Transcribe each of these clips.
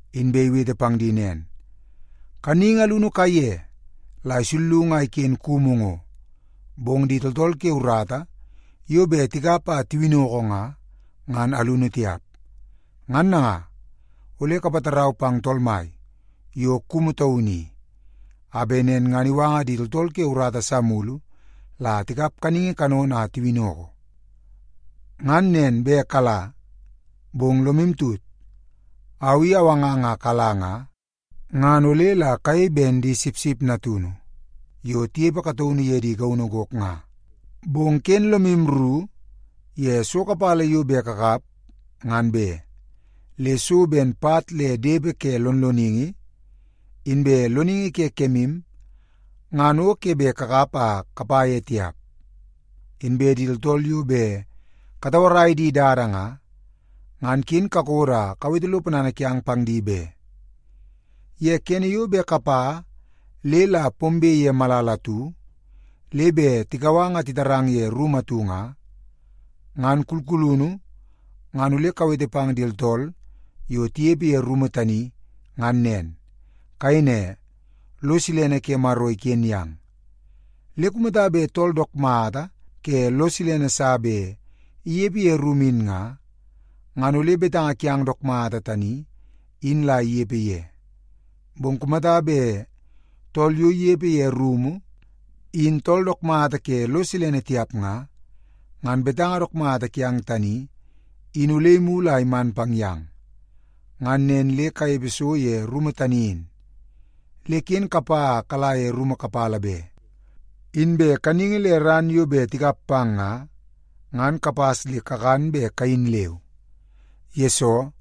Inbe iwete pang di nen, “Kaningi alunu kaiye la isullungu a iken kumu ngo, bong di tooltool ke urata yo bet tikap a tiwinnoko nga, ngan alunu tiap. Ngan nanga, ole kapatarau pang Tool Mai yo kumu taunu i, a bet nen ngan iwanga di tooltool ke urata sa mulu la tikap kaningi kanono a tiwinnoko. Ngan nen bet kala! Bong lomu tut, au i awangang a kala nga, ngan ole la kayei ben di sipsip natunu yo tinepe kataunu ye di gaunu gok nga. Bong ken lomu ru ye so kapala yo bet kakap ngan be. Le so ben pat le depe ke lonloningi, inbe loningi ke kemu ngan o ke bet kakap a kapa ye tiap. Inbe di tooltool yo bet katauarai di dada nga, ngan ken kakodo a kawete lo ponana kiang pang di be. “Ye kene yo bet kapa le la pombe ye malala atu, le bet tikau ang a titarang ye rumu atu nga, ngan kulkulunu ngan ole kawete pang di tooltool yo tinepe ye rumu tani, ngan nen. Kayei ne, ‘Lo silene ke Maro iken yang.’ Le kumata bet tool dook mata ke lo silene sa bet inepe ye rumu in nga, ngan ole betanga kiang dook mata tani in la inepe ye. Bong kumata bet tool yo inepe ye rumu in tool dook mata ke lo silene tiap nga, ngan betanga dook mata kiang tani, in ole imulu a iman pang yang. Ngan nen le kanepe so ye rumu tani in, le ken kapa a kala ye rumu kapala be. Inbe kaningi le ran yo bet tikap pang nga ngan kapas le kakan be kayin leu, yesoo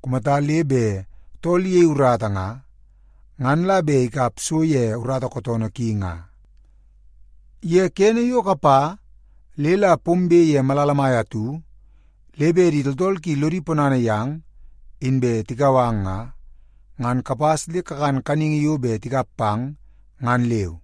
kumata le bet tool iyei urata nga, ngan la bet ikap so ye urata kootoonoo ki nga. “Ye kene yo kapa le la pombe ye malala mai atu le bet di tooltool ki lodi ponana yang, inbe tikau ang nga, ngan kapas le kakan kaningi yo bet tikap pang ngan leu.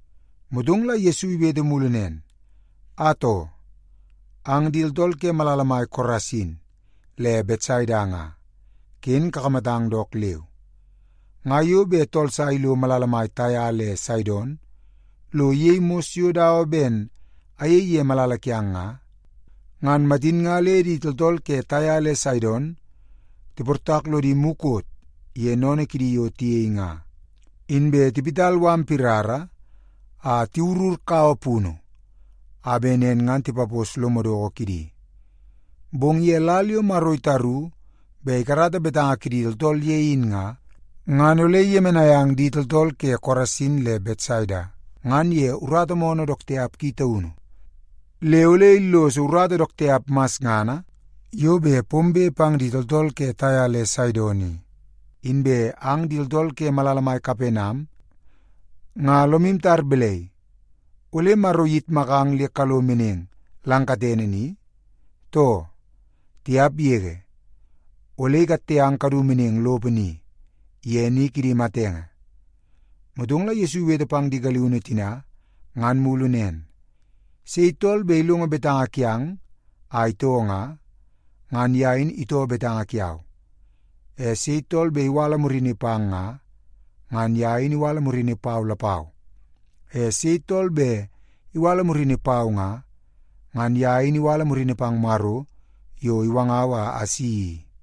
Motong la Yesu iwete mulu nen, “Atoo! Ang di tooltool ke malala mai Korasin le Betsaida nga, ken kakamatang dook leu. Nga yo bet tool sa ilo malala mai Taia le Saidon lo iyei mos yo dawa ben ayei ye malala kiang nga, ngan matin nga le di tooltool ke Taia le Saidon tiportak lodi mukot ye sennene kidi yo tiyei nga, inbe tiwit mala pirara a tiwurur kaua punu a bet nen ngan tipapos lo madoko kidi. Bong ye lal yo Maro itaru bet ikarata betanga kidi tooltool ye in nga, ngan ole iyemenai ang di tooltool ke Korasin le Betsaida ngan ye urata moonoo dook tiap ki taunu le ole illoso urata dook tiap masngana yo bet pombe pang di tooltool ke Taia le Saidon i. Inbe ang di tooltool ke malala mai Kapenam nga lomu tar balai, ole Maro iyitmakang le kalo meneng lang katene ni, too? Tiap yege! Ole ikatte ang kadu meneng lopo ni, ye ni kidi matenge.” Motong la Yesu iwete pang di galiunu tina ngan mulu nen, “Sei tool bet ilongo betanga kiang a itoo nga, ngan ye in itoo betanga kiau. E sei tool bet iwala murini pang nga, ngan ye in iwala murini pau lapau. E sei tool bet iwala murini pau nga, ngan ye in iwala murini pang Maro yo iwangau a asi i.”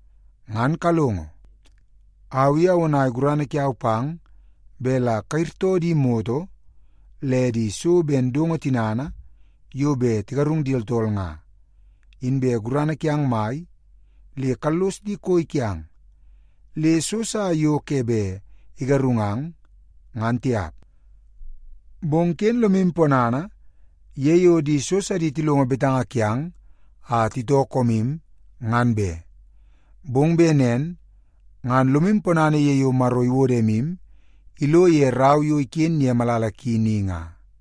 Ngan kalongo. Au i awonai gurana kiau pang bet la kayirtoo di moto le di so ben dongo parangana bet tigarung di tooltool nga, inbe gurana kiang mai le kallos di koi kiang, le so sa yo ke bet igarungang, ngan tiap. Bong ken lomu ponana ye yo di so sidi tilongo betanga kiang a titoo koomu, ngan be. Bong bet nen ngan lomu ponana ye yo Maro iwodo emu ilo ye rau yo iken ye malala ki ni nga.”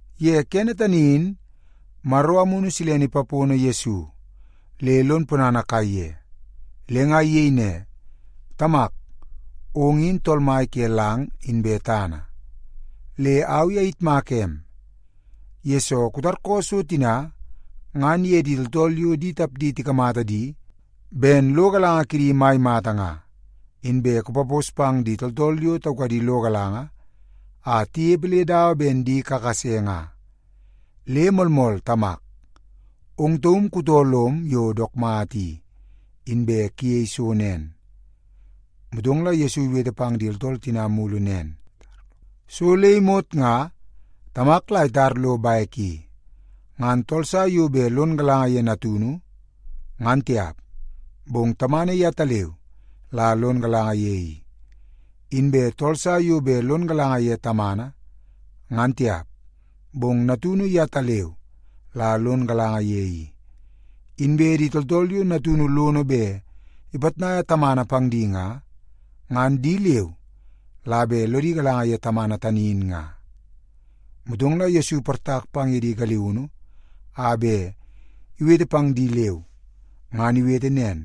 Ye kene tani in, Maro Amunu Silene ipapono Yesu le lon ponana kaiye, le nga iyei ne, “Tamak, ong in Tool Mai ke lang inbe tana. Le au i ayitmaka em, yesoo kutarkoo so tina ngan ye di tooltool yo di tapdi tikamata di ben lo galanga kidi mai mata nga, inbe kupapos pang di tooltool yo taukadi lo galanga a tinepe le dawa ben di kakase nga. Le moolmool Tamak, ong taum kutoo lom yo dook mata i, inbe kuyei so nen.” Motong la Yesu iwete pang di tooltool tina mulu nen, “So le imot nga Tamak la itar lo bek i. Ngan tool sa yo bet lon galanga ye Natunu, ngan tiap, bong Tamana yetaleu la lon galanga ye i. Inbe tool sa yo bet lon galanga ye Tamana, ngan tiap, bong Natunu yetaleu la lon galanga ye i. Inbe di tooltool yo Natunu lono bet ipitnaia Tamana pang di nga, ngan di leu la bet lodi galanga ye Tamana tani in nga.” Motong la Yesu iportak pang ye di galiunu a bet iwete pang di leu, ngan iwete nen,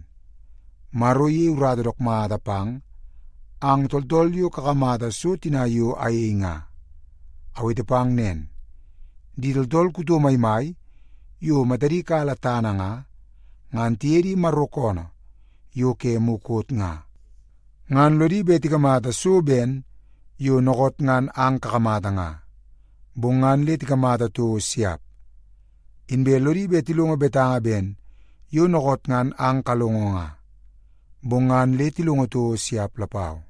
“Maro iyei urata dook mata pang ang tooltool yo kakamata so tina yo ayei nga. Awete pang nen, di tooltool kuto maimai yo matadi kala tana nga, ngan tiye di Maro koonoo yo ke mukot nga, ngan lodi bet tikamata so ben yo dookoot ngan ang kakamata nga, bong ngan le tikamata toko siap. Inbe lodi bet tilongo betanga ben yo dookoot ngan ang kalongo nga, bong ngan le tilongo toko siap lapau.”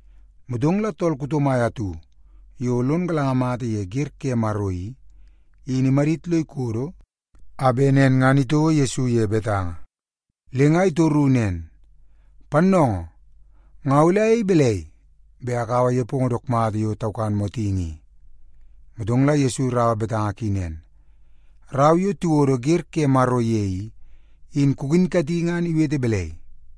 Motong la tool kuto mai atu yo lon galanga mata ye wer ke Maro i, in imadit lo ikodo a bet nen ngan itouo Yesu ye betanga. Le nga itoru nen, “Pannoongoo, nga ole ayei balai bet akaua nepongo dook mata yo taukan motingi i?” Motong la Yesu iraua torungu ki nen, “Rau yo tiwodo wer ke Maro ye i, in kukinkati ngan iwete balai?”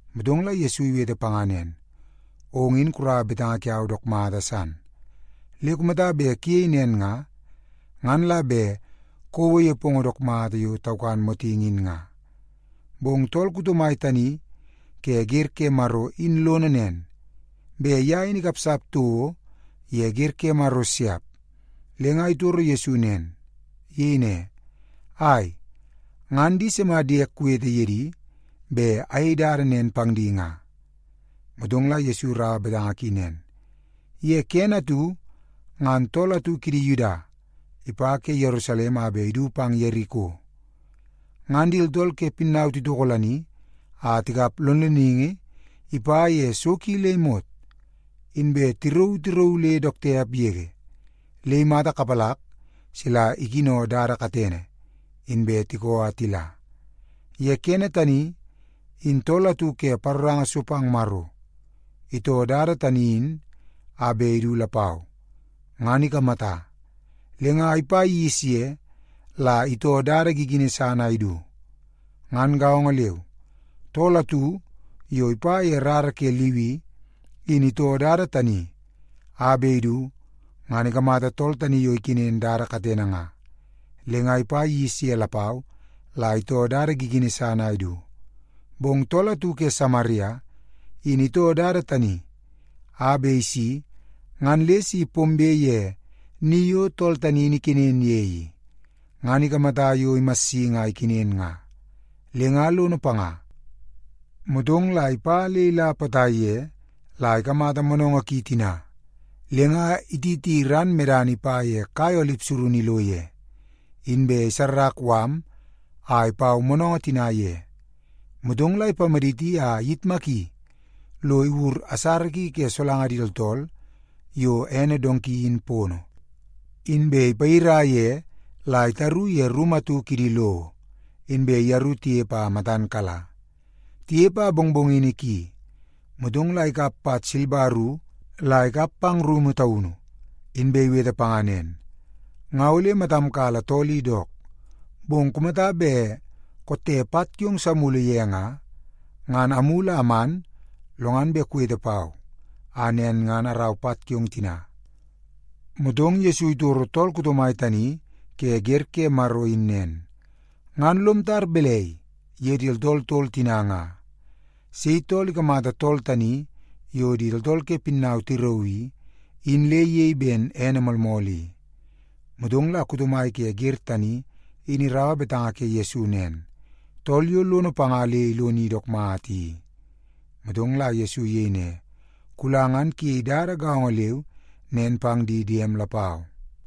Motong la Yesu iwete panga nen, “Ong in kuraua betanga kiau dook mata san. Le kumata bet kuyei nen nga, ngan la bet kouo nepongo dook mata yo takan motingi in nga.” Bong tool kuto mai tani ke wer ke Maro in lono nen, bet ye in ikapsap toko ye wer ke Maro siap, le nga itoro Yesu nen. Iyei ne, “Ai, ngan di sima diek kuwete ye di bet ayei dada nen pang di nga?” Motong la Yesu iraua betanga ki nen, “Ye kene atu ngan tool atu kidi Yuda ipa ke Yerusalem a bet idu pang Yeriko. Ngan di tooltool ke pinnau titokolani a tikap lonloningi ipa ye so ki le imot, inbe tirauu tirauu le dook tiap yege, le imata sap sila ikino dada katene, inbe tikoo a tila. Ye kene tani in tool atu ke paroranga so pang Maro itoo dada tani in a bet idu lapau, ngan ikamata. Le nga ipa gis ye la itoo dada gigini san a idu. Ngan gaongo leu, tool atu yo ipa ye rara ke Liwi in itoo dada tani a bet idu ngan ikamata tool tani yo ikenen dada katene nga, le nga ipa gis ye lapau la itoo dada gigini san a idu. Bong tool atu ke Samaria in itoo dada tani a bet isi ngan le si pombe ye ni yo tool tani in ikenen ye i, ngan ikamata yo imassingi a ikenen nga, le nga lono panga. Motong la ipa le ila potai ye la ikamata moonoongoo ki tina, le nga ititi ran medana ipa ye kai olip surunu ilo ye, inbe isarrak mala a ipau moonoongoo tina ye. Motong la ipamaditi a iyitmaki lo iwur asara ki ke solanga di tooltool yo ene donki in pono, inbe ipayira ye la itaru ye rumu atu kidi lowo, inbe yeru tinepe a matan kala. Tinepe a mongmongini ki, motong la ikap pat silba ru la ikap pang rumu taunu, inbe iwete panga nen, ‘Nga ole matam kala tool i dook, bong kumata bet kotte pat kiong sa mulu ye nga, ngan amulu a aman lo ngan bet kuwete pau a nen ngan arau pat kiong tina.’” Motong Yesu titoro tool kuto mai tani ke wer ke Maro in nen, “Ngan lom tar balai ye di tooltool tol tina nga? Sei tool ikamata tool tani yo di tooltool ke pinnau tirauu i, in le iyei ben ene moolmool i?” Motong la kuto mai ke wer tani in iraua betanga ke Yesu nen, “Tool yo lono panga le iloni dook mata i.” Motong la Yesu iyei ne, “Kula ngan kuyei dada gaongo leu nen pang di diem lapau.”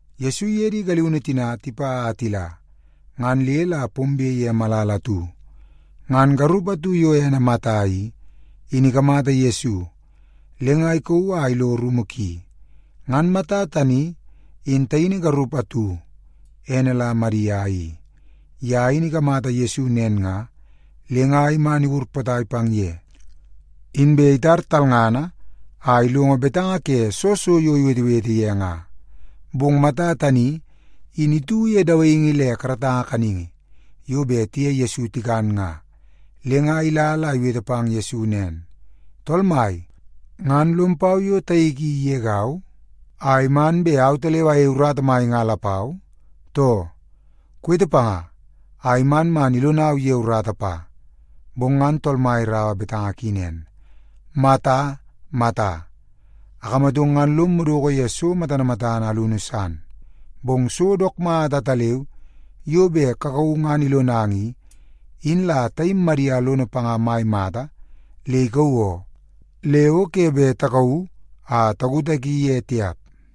Yesu iye di galiunu tina tipa a tila, ngan le la pombe ye malala atu. Ngan garup atu yo ene Mata i, in ikamata Yesu, le nga ikauu a ilo rumu ki. Ngan Mata tani in taini garup atu, ene la Madia i. Ye in ikamata Yesu nen nga, le nga iman iwur potai pang ye, inbe itar talngana a ilongo betanga ke soo so yo iwetewete ye nga. Bong Mata tani in itu ye dawaingi le karatanga kaningi yo bet tiye Yesu tikan nga, le nga ila la iwete pang Yesu nen, “Tool Mai, ngan lom pau yo taik i igegau a iman bet autaleu ayei urata mai nga lapau, too? Kuwete panga a iman man ilonau ye urata pa.” Bong ngan Tool Mai iraua betanga ki nen, “Mata, Mata, akamatong ngan lom madoko ye so matana matana alunu san. Bong so dook mata ataleu yo bet kakauu ngan ilonang i, in la taim Madia lono panga mai mata le ikauu oo. Le o ke bet takauu a takutaki ye tiap.”